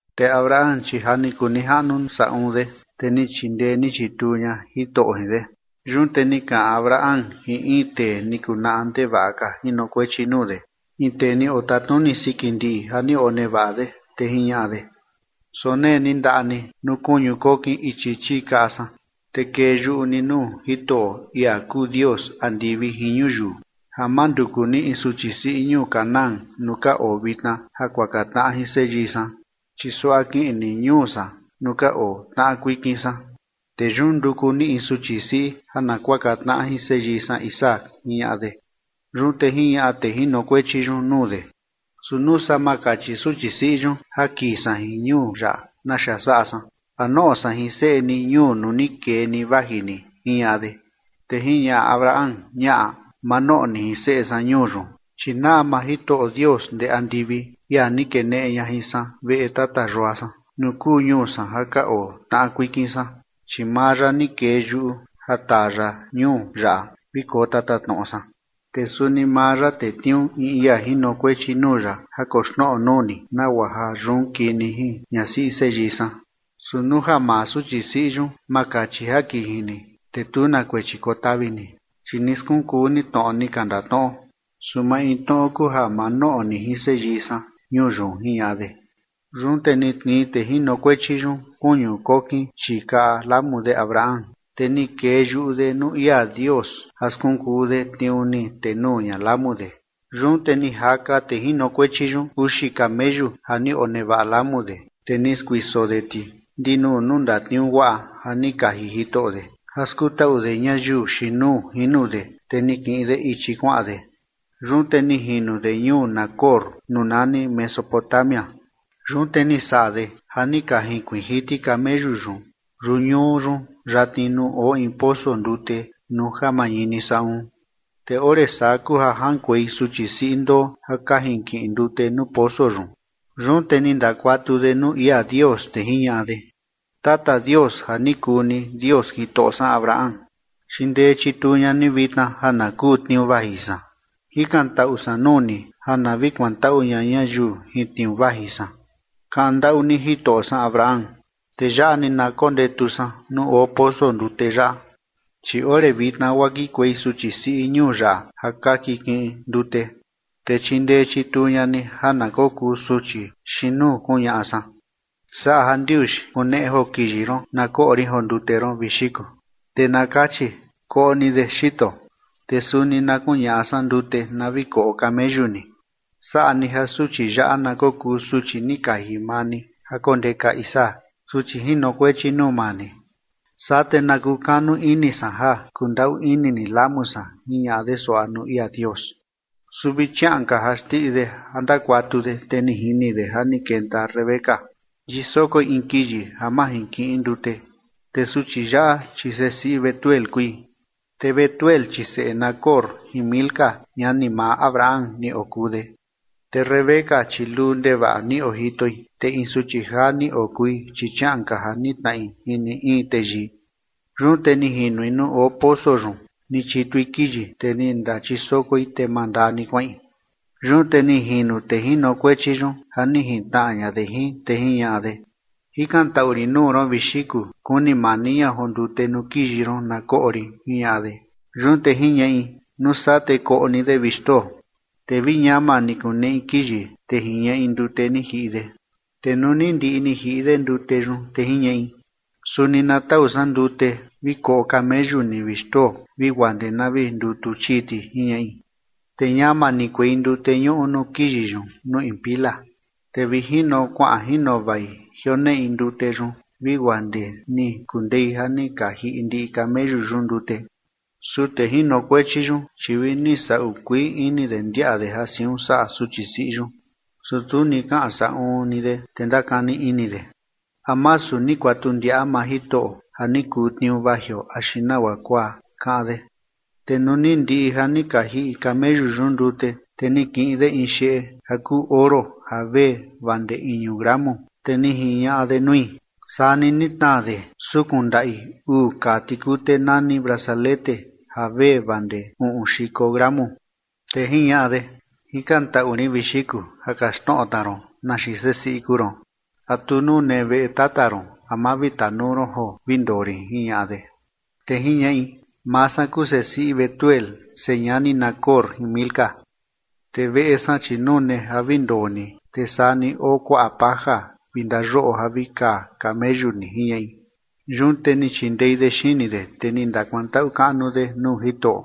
Te Abraham, chi ja ni kuu nijaꞌnu saꞌun de, te ni chindee ni chituu ña Jitoꞌo jin de. Yun te ni kaꞌan Abraham jin in tee ni kuu naꞌa ndevaꞌa ka jinokuechi nuu de, in tee ni otatnuni siki ndiꞌi ja ni onevaꞌa de, te jiñaꞌa de: ―Sonee ni ndaꞌa ni nuu kuñu kokin ichi chii kaꞌa san. Te kee yuꞌu ni nuu Jitoꞌo, ia kuu Dios andivi jin ñuyiu, ja ma nduku ni in suchi siꞌi ñuu Canaán nuu ka oo vitna ja kuaka tnaꞌa jin seyii san. Chi suaꞌa kiꞌin ni ñuu san nuu ka oo tnaꞌa kuikin san, te yun nduku ni in suchi siꞌi ja na kuaka tnaꞌa jin seyii san Isaac ―jiñaꞌa de. Yun te jiñaꞌa tee jinokuechi yun nuu de: ―Su nuu saa ma kachi suchi siꞌi yun ja kii san jin ñuu yaꞌa, ¿naxa saꞌa san? ¿A noꞌo san jin seꞌe ni ñuu nuu ni kee ni vaji ni? ―jiñaꞌa de. Te jiñaꞌa Abraham: ―Ñaꞌa. Ma noꞌo ni jin seꞌe san ñuu yun. Chi naꞌa maa Jitoꞌo Dios ndee andivi, ia ni keneꞌe ña jin san veꞌe tata yua san nuu kuu ñuu san ja ka oo tnaꞌa kuikin san, chi maa ya ni kee yuꞌu ja taa ya ñuu yaꞌa vi koo tatatnoꞌo san. Te suni maa ya tetniuu in ia jinokuechi nuu ya ja koxnoꞌo nuu ni, nagua ja yun kii ni jin ñasiꞌi seyii san. Su nuu ja maa suchi siꞌi yun ma kachi ja kii jin ni, te tu na kuechi kotavi ni, chi ni skunkuu ni tnoꞌo ni ka ndatnoꞌo. Su maintnoꞌo kuu ja ma noꞌo ni jin seyii san ñuu yun ―jiñaꞌa de. Yun te ni tnii tee jinokuechi yun kuñu kokin chii kaꞌa lamu de Abraham, te ni kee yuꞌu de nuu ia Dios ja skunkuu de tniuu ni tenuu ña lamu de. Yun te ni jaka tee jinokuechi yun uxi kameyu ja ni onevaꞌa lamu de, te ni skuiso de ti ndinuu nuu ndatniuu guaꞌa ja ni kaji jitoꞌo de, ja skutaꞌu de ñayiu xiin nuu jino de, te ni kiꞌin de ichi kuaꞌan de. Yun te ni jino de ñuu Nacor nuu nani Mesopotamia. Yun te ni saꞌa de ja ni ka jinkuiin jiti kameyu yun yuñuu yun yatni nuu oo in poso ndute nuu ja mañini saꞌun. Te ore saa kuu ja jaꞌankuei suchi siꞌi ndoo ja ka jinkiꞌin ndute nuu poso yun. Yun te ni ndakuatu de nuu ia Dios, te jiñaꞌa de: ―Tata Dios ja ni kuu ni Dios jitoꞌo san Abraham, chindee chituu ña ni vitna ja na kuu tniuu vaji san jikantaꞌu san nuu ni ja na vi kuantaꞌu ña ñayiu jin tniuu vaji san kaꞌan ndaꞌu ni jitoꞌo san Abraham. Te yaꞌa ni na kondetu san nuu oo poso ndute yaꞌa, chi ore vitna guaa kikuei suchi siꞌi ñuu yaꞌa ja ka kikiꞌin ndute. Te chindee chituu ña ni ja na kokuu suchi xiin nuu kuñaꞌa san: “Saꞌa jandiuxi kuneꞌe joo kiyi ron na koꞌo rin joo ndute ron, vi xiku”, te na kachi: “Koꞌo ni de, xito, te suni na kuñaꞌa san ndute na vi koꞌo kameyu ni”. Saꞌa ni ja suchi yaꞌa na kokuu suchi ni kaji maa ni ja kondeka Isaac, suchi jinokuechi nuu maa ni. Saa te na kukanu ini san ja kundaꞌu ini ni lamu san ―jiñaꞌa de suaꞌa nuu ia Dios. Su vi chiaꞌan ka ja xndiꞌi de ja ndakuatu de, te ni jini de ja ni kenta Rebeca, yisokoi in kiyi ja majinkiꞌin ndute. Te suchi yaꞌa, chi sesiꞌi Betuel kui, te Betuel chi seꞌe Nacor jin Milca, ñani maa Abraham ni okuu de. Te Rebeca, chi luu ndevaꞌa ni ojitoi, te in suchi jaa ni okui, chi chiaꞌan ka ja nitnaꞌi jin ni in teyii. Yun te ni jinui nuu oo poso yun ni chitui kiyi, te ni ndachisokoi te mandaa ni kuaꞌin. Yun te ni jino tee jinokuechi yun ja ni juntnaꞌa ña de jin, te jiñaꞌa de: ―Jikantaꞌu rin nuu ron, vi xiku, kuni mani ña joo ndute nuu kiyi ron na koꞌo rin ―jiñaꞌa de. Yun te jiñaꞌi: ―Nuu saa te koꞌo ni de, vi xtoo. Te vi ñama ni kuneꞌi kiyi, te jiñaꞌi ndute ni jiꞌi de. Te nuu ni ndiꞌi ni jiꞌi de ndute yun, te jiñaꞌi: ―Suni na tau san ndute vi koꞌo kameyu ni, vi xtoo, vi guaa ndee na vi ndutu chii ti ―jiñaꞌi. Te ñama ni kuei ndute ñuꞌu nuu kiyi yun nuu in pila, te vi jino kuaꞌan jino vai jioneꞌi ndute yun vi guaa ndee ni kundei ja ni ka jiꞌi ndiꞌi kameyu yun ndute. Su tee jinokuechi yun, chi vini saꞌu kuii ini de ndiaꞌa de ja siun saꞌa suchi siꞌi yun, su tu ni kaꞌan saꞌun ni de, te ndakani ini de: ¿A masu ni kuatu ndiaꞌa maa Jitoꞌo ja ni kuu tniuu vajio axi nagua kuaa?, kaꞌan de. Te nuu ni ndiꞌi ja ni ka jiꞌi kameyu yun ndute, te ni kiꞌin de in xeꞌe ja kuu oro ja vee vaa ndee iñu gramu, te ni jiñaꞌa de nui, saa ni ni tnaa de sukun ndaꞌi uu kaa tikute nani brazalete ja vee vaa ndee uꞌun xiko gramu. Te jiñaꞌa de: ―Jikantaꞌu rin, vi xiku, ja kaxtnoꞌo tna ron, ¿na xiin sesiꞌi kuu ron? ¿A tu nune veꞌe tata ron a ma vi tanuu ron joo vi ndoo rin? ―jiñaꞌa de. Te jiñaꞌi: ―Maa san kuu sesiꞌi Betuel señani Nacor jin Milca, te veꞌe san, chi nune ja vi ndoo ni, te suni oo kuaꞌa paja vi ndayoꞌo ja vi kaa kameyu ni ―jiñaꞌi. Yun te ni chindei de xini de, te ni ndakuantaꞌu kaꞌnu de nuu Jitoꞌo.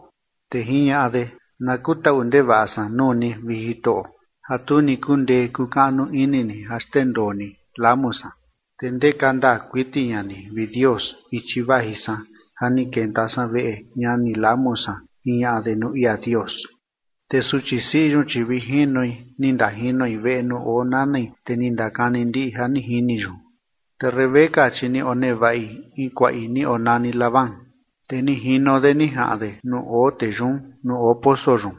Te jiñaꞌa de: ―Na kutaꞌu ndevaꞌa san nuu ni, vi Jitoꞌo, ja tu ni kundee kuu kaꞌnu ini ni ja xndendoo ni lamu san, te ndeka ndaa kuiti ña ni, vi Dios, ichi vaji san ja ni kenta san veꞌe ñani lamu san ―jiñaꞌa de nuu ia Dios. Te suchi siꞌi yun, chi vi jinoi ni ndajinoi veꞌe nuu oo nanai, te ni ndakani ndiꞌi ja ni jini yun. Te Rebeca, chi ni onevaꞌi in kuaꞌi ni onani Labán. Te ni jino de ni jaꞌan de nuu oo tee yun nuu oo poso yun,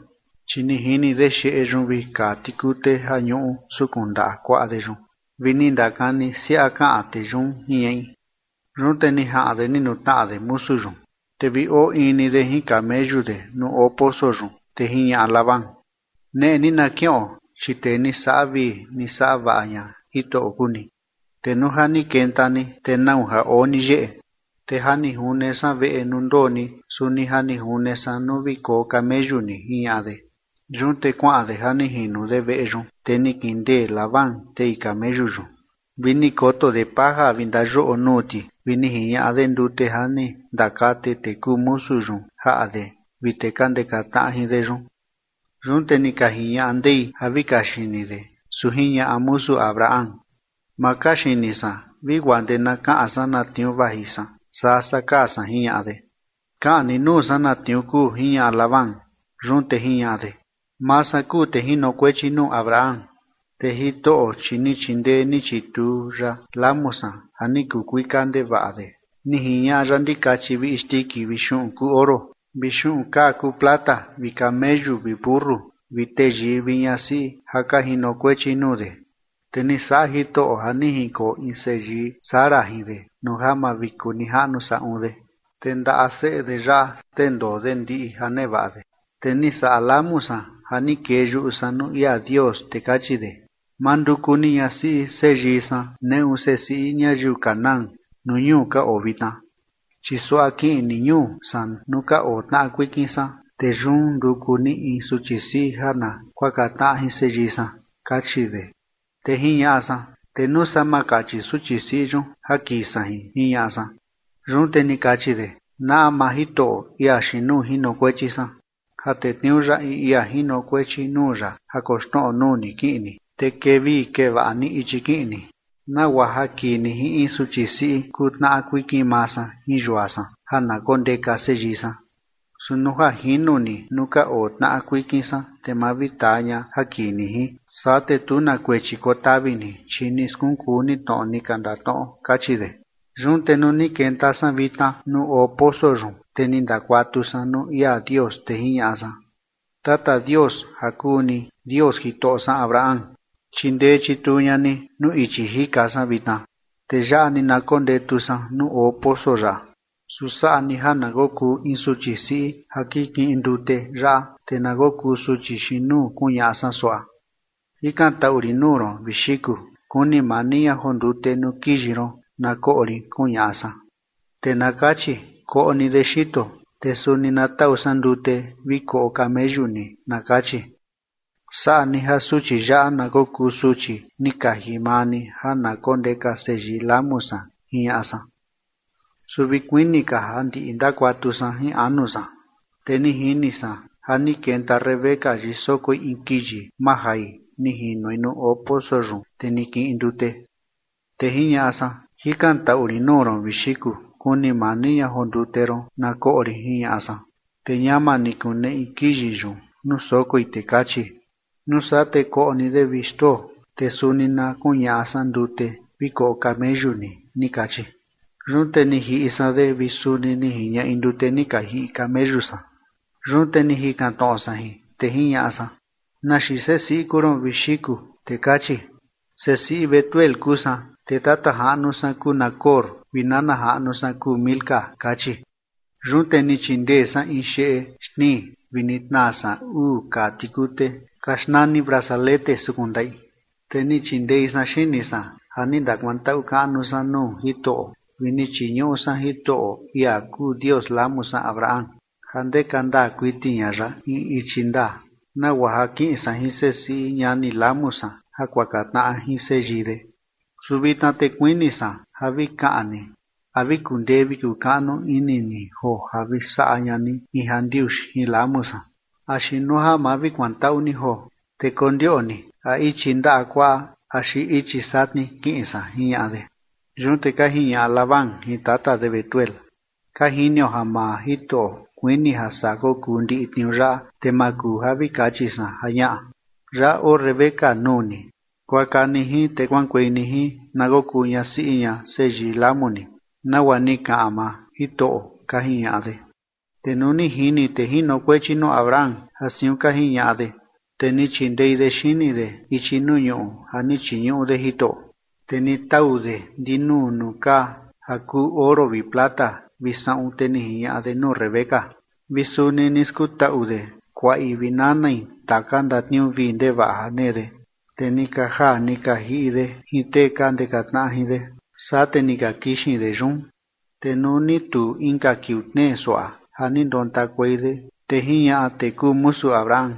chi ni jini de xeꞌe yun vi kaa tikute ja ñuꞌu sukun ndaꞌa kuaꞌa de yun, vi ni ndakani siaꞌa kaꞌan tee yun, jiñaꞌi. Yun te ni jaꞌan de ni nutnaꞌa de musu yun, te vi oo ii ni de jin kameyu de nuu oo poso yun. Te jiñaꞌa Labán: ―Neꞌe ni na kiꞌon, chi tee ni saꞌa vii ni saꞌa vaꞌa ña Jitoꞌo kuu ni, te nuu ja ni kenta ni, ¿te nau ja oo ni yeꞌe? Te ja ni june san veꞌe nuu ndoo ni, suni ja ni june san nuu vi koo kameyu ni ―jiñaꞌa de. Yun te kuaꞌan de ja ni jino de veꞌe yun, te ni kindee Labán tei kameyu yun vi ni koto de paja vi ndayoꞌo nuu ti vi ni jiñaꞌa de ndute ja ni ndakate tee kuu musu yun jaꞌa de vi tee ka ndeka tnaꞌa jin de yun. Yun te ni ka jiñaꞌa ndei ja vi kaxini de, su jiñaꞌa musu Abraham: ―Ma kaxini san vi guaa ndee na kaꞌan san na tniuu vaji san saa saa kaa san ―jiñaꞌa de. ―Kaꞌan ni nuu saa na tniuu kuu ―jiñaꞌa Labán. Yun te jiñaꞌa de: ―Maa san kuu tee jinokuechi nuu Abraham. Te Jitoꞌo, chi ni chindee ni chituu ya lamu san ja ni kuu kuika ndevaꞌa de. Ni jiñaꞌa ya ndikachi vi isndiki vi xuꞌun kuu oro vi xuꞌun kaa kuu plata vi kameyu vi mentu vi teyii vi ñasiꞌi ja ka jinokuechi nuu de. Te ni saꞌa Jitoꞌo ja ni jinkoo in seyii Sara jin de nuu ja mavikunijaꞌnu saꞌun de, te ndaꞌa seꞌe de yaꞌa xndendoo de ndiꞌi ja nevaꞌa de. Te ni saꞌa lamu san ja ni kee yuꞌu san nuu ia Dios, te kachi de: “Ma nduku ni ñasiꞌi seyii san neꞌu sesiꞌi ñayiu Canaán nuu ñuu ka oo vitna. Chi suaꞌa kiꞌin ni ñuu san nuu ka oo tnaꞌa kuikin san, te yun nduku ni in suchi siꞌi ja na kuaka tnaꞌa jin seyii san”, kachi de. Te jiñaꞌa san: “Te ¿nuu saa ma kachi suchi siꞌi yun ja kii san jin?”, jiñaꞌa san. Yun te ni kachi de: “Naꞌa maa Jitoꞌo, ia xiin nuu jinokuechi san, ja tetniuu ya in ia jinokuechi nuu ya ja koxnoꞌo nuu ni kiꞌin ni, te kee vii kee vaꞌa ni ichi kiꞌin ni, nagua ja kii ni jin in suchi siꞌi kuu tnaꞌa kuikin maa san jin yua san ja na kondeka seyii san. Su nuu ja jino ni nuu ka oo tnaꞌa kuikin san, te ma vi taa ña ja kii ni jin, saa te tu na kuechi kotavi ni, chi ni skunkuu ni tnoꞌo ni ka ndatnoꞌo”, kachi de. Yun te nuu ni kenta san vitna nuu oo poso yun, te ni ndakuatu san nuu ia Dios, te jiñaꞌa san: “Tata Dios ja kuu ni Dios jitoꞌo san Abraham, chindee chituu ña ni nuu ichi jika san vitna, te yaꞌa ni na kondetu san nuu oo poso yaꞌa, su saꞌa ni ja na kokuu in suchi siꞌi ja kikiꞌin ndute yaꞌa, te na kokuu suchi xiin nuu kuñaꞌa san suaꞌa: Jikantaꞌu rin nuu ron, vi xiku, kuni mani ña joo ndute nuu kiyi ron na koꞌo rin, kuñaꞌa san, te na kachi: Koꞌo ni de, xito, te suni na tau san ndute vi koꞌo kameyu ni, na kachi. Saꞌa ni ja suchi yaꞌa na kokuu suchi ni kaji maa ni ja na kondeka seyii lamu san”, jiñaꞌa san. Su vi kuini ka ja ndiꞌi ndakuatu san jin anu san, te ni jini san ja ni kenta Rebeca yisokoi in kiyi majai ni jinoi nuu oo poso yun, te ni kiꞌin ndute. Te jiñaꞌa san: “Jikantaꞌu rin nuu ron, vi xiku, kuni mani ña joo ndute ron na koꞌo rin”, jiñaꞌa san. Te ñama ni kuneꞌi kiyi yun nuu sokoi, te kachi: “Nuu saa te koꞌo ni de, vi xtoo, te suni na kuñaꞌa san ndute vi koꞌo kameyu ni”, ni kachi. Yun te ni jiꞌi san de vi suni ni jiñaꞌi ndute ni ka jiꞌi kameyu san. Yun te ni jikan tnoꞌo san jin, te jiñaꞌa san: “¿Na xiin sesiꞌi kuu ron, vi xiku?” Te kachi: “Sesiꞌi Betuel kuu san, te tata jaꞌnu san kuu Nacor vi nana jaꞌnu san kuu Milca”, kachi. Yun te ni chindee san in xeꞌe xtnii vi ni tnaa san uu kaa tikute ka xnani brazalete sukun ndaꞌi. Te ni chindei san xini san ja ni ndakuantaꞌu kaꞌnu san nuu Jitoꞌo vi ni chiñuꞌu san Jitoꞌo, ia kuu Dios lamu san Abraham ja ndeka ndaa kuiti ña ya in ichi ndaa, nagua ja kiꞌin san jin sesiꞌi ñani lamu san ja kuaka tnaꞌa jin seyii de. Su vitna te kuini san ja vi kaꞌan ni a vi kundee vi kukaꞌnu ini ni joo ja vi saꞌa ña ni in jandiuxi jin lamu san axi nuu ja ma vi kuantaꞌu ni joo, te kondioꞌni a ichi ndaꞌa kuaꞌa axi ichi satni kiꞌin san ―jiñaꞌa de. Yun te ka jiñaꞌa Labán jin tata de Betuel: ―Ka jinio ja maa Jitoꞌo kuini ja saa kokuu ndiꞌi tniuu yaꞌa, te ma kuu ja vi kachi san ja ñaꞌa. Yaꞌa oo Rebeca nuu ni. Kuaka ni jin te kuaꞌankuei ni jin na kokuu ñasiꞌi ña seyii lamu ni, nagua ni kaꞌan maa Jitoꞌo ―ka jiñaꞌa de. Te nuu ni jini tee jinokuechi nuu Abraham ja siun ka jiñaꞌa de, te ni chindei de xini de ichi nuu ñuꞌu ja ni chiñuꞌu de Jitoꞌo. Te ni tau de ndinuu nuu kaa ja kuu oro vi plata vi saꞌun, te ni jiñaꞌa de nuu Rebeca vi suni ni skutaꞌu de kuaꞌi vi nanai taka ndatniuu vii ndevaꞌa ja nee de. Te ni ka jaa ni ka jiꞌi de jin tee ka ndeka tnaꞌa jin de, saa te ni ka kixin de yun. Te nuu ni tuu inka kiuu tnee suaꞌa ja ni ndontakuei de, te jiñaꞌa tee kuu musu Abraham: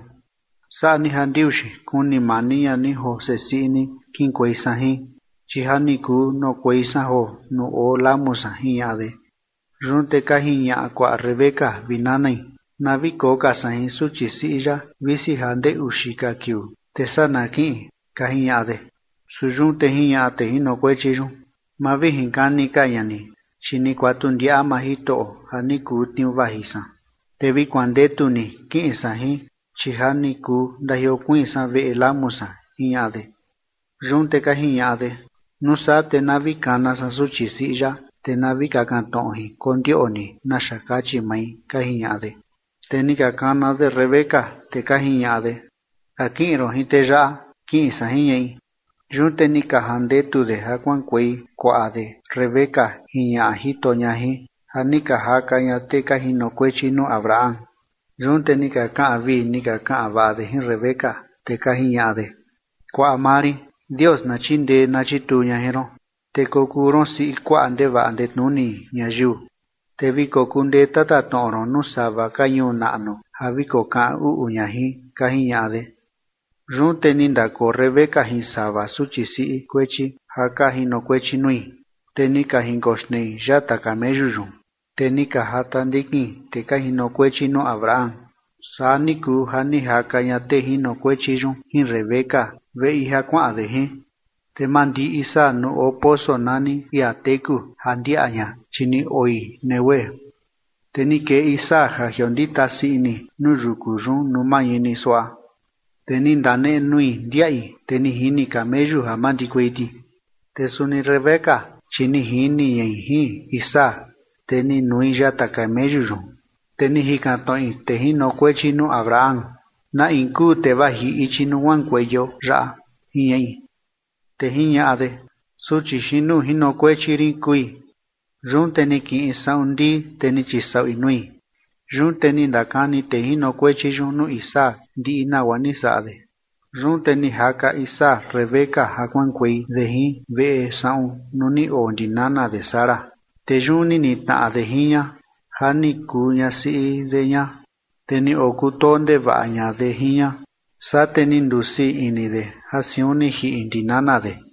―Saꞌa ni jandiuxi kuni mani ña ni joo sesiꞌi ni kiꞌinkuei san jin, chi ja ni kuu noꞌokuei san joo nuu oo lamu san ―jiñaꞌa de. Yun te ka jiñaꞌa kuaꞌa Rebeca vi nanai: ―Na vi koo ka san jin suchi siꞌi yaꞌa, visi ja ndee uxi ka kiuu, te saa na kiꞌin ―ka jiñaꞌa de. Su yun te jiñaꞌa tee jinokuechi yun: ―Ma vi jinkani ka ña ni, chi ni kuatu ndiaꞌa maa Jitoꞌo ja ni kuu tniuu vaji san, te vi kuandetu ni kiꞌin san jin, chi ja ni kuu ndajiokuiin san veꞌe lamu san ―jiñaꞌa de. Yun te ka jiñaꞌa de: ―Nuu saa te na vi kana san suchi siꞌi yaꞌa, te na vi kakan tnoꞌo jin kondioꞌni naxa kachi mai ―ka jiñaꞌa de. Te ni ka kana de Rebeca, te ka jiñaꞌa de: ―¿A kiꞌin ron jin tee yaꞌa? ―Kiꞌin san ―jiñaꞌi. Yun te ni ka jandetu de ja kuaꞌankuei kuaꞌa de Rebeca jin ñaꞌa jito ña jin, ja ni ka jaka ña tee ka jinokuechi nuu Abraham. Yun te ni ka kaꞌan vii ni ka kaꞌan vaꞌa de jin Rebeca, te ka jiñaꞌa de: Kuaꞌa maa rin, Dios na chindee na chituu ña jin ron, te kokuu ron siꞌi kuaꞌa ndevaꞌa ndetnuni ñayiu, te vi kokundee tatatnoꞌo ron nuu sava ka ñuu naꞌnu ja vi kokaꞌan uꞌu ña jin, ka jiñaꞌa de. Yun te ni ndakoo Rebeca jin sava suchi siꞌi kuechi ja ka jinokuechi nui, te ni ka jinkoxnei yata kameyu yun, te ni ka jata ndikin tee ka jinokuechi nuu Abraham. Saa ni kuu ja ni jaka ña tee jinokuechi yun jin Rebeca veꞌi ja kuaꞌan de jin. Te mandii Isaac nuu oo poso nani ia teku ja ndiaꞌa ña, chi ni oi Neguev. Te ni kee Isaac ja jiondita sii ini nuu yuku yun nuu mañini suaꞌa, te ni ndanenui ndiaꞌi, te ni jini kameyu ja mandikuei ti. Te suni Rebeca, chi ni jini ñai jin Isaac, te ni nui yata kameyu yun. Te ni jikan tnoꞌi tee jinokuechi nuu Abraham: ―¿Na in kuu tee vaji ichi nuu kuaꞌankueio yaꞌa? ―jiñaꞌi. Te jiñaꞌa de: ―Suchi xiin nuu jinokuechi rin kui. Yun te ni kiꞌin saꞌun ndii, te ni chisaꞌui nui. Yun te ni ndakani tee jinokuechi yun nuu Isaac ndiꞌi nagua ni saꞌa de. Yun te ni jaka Isaac Rebeca ja kuaꞌankuei de jin veꞌe saꞌun nuu ni oo ndi nana de Sara, te yun ni nitnaꞌa de jin ña ja ni kuu ñasiꞌi de ña, te ni okutoo ndevaꞌa ña de jin ña. Saa te ni ndusii ini de ja siun ni jiꞌi ndi nana de.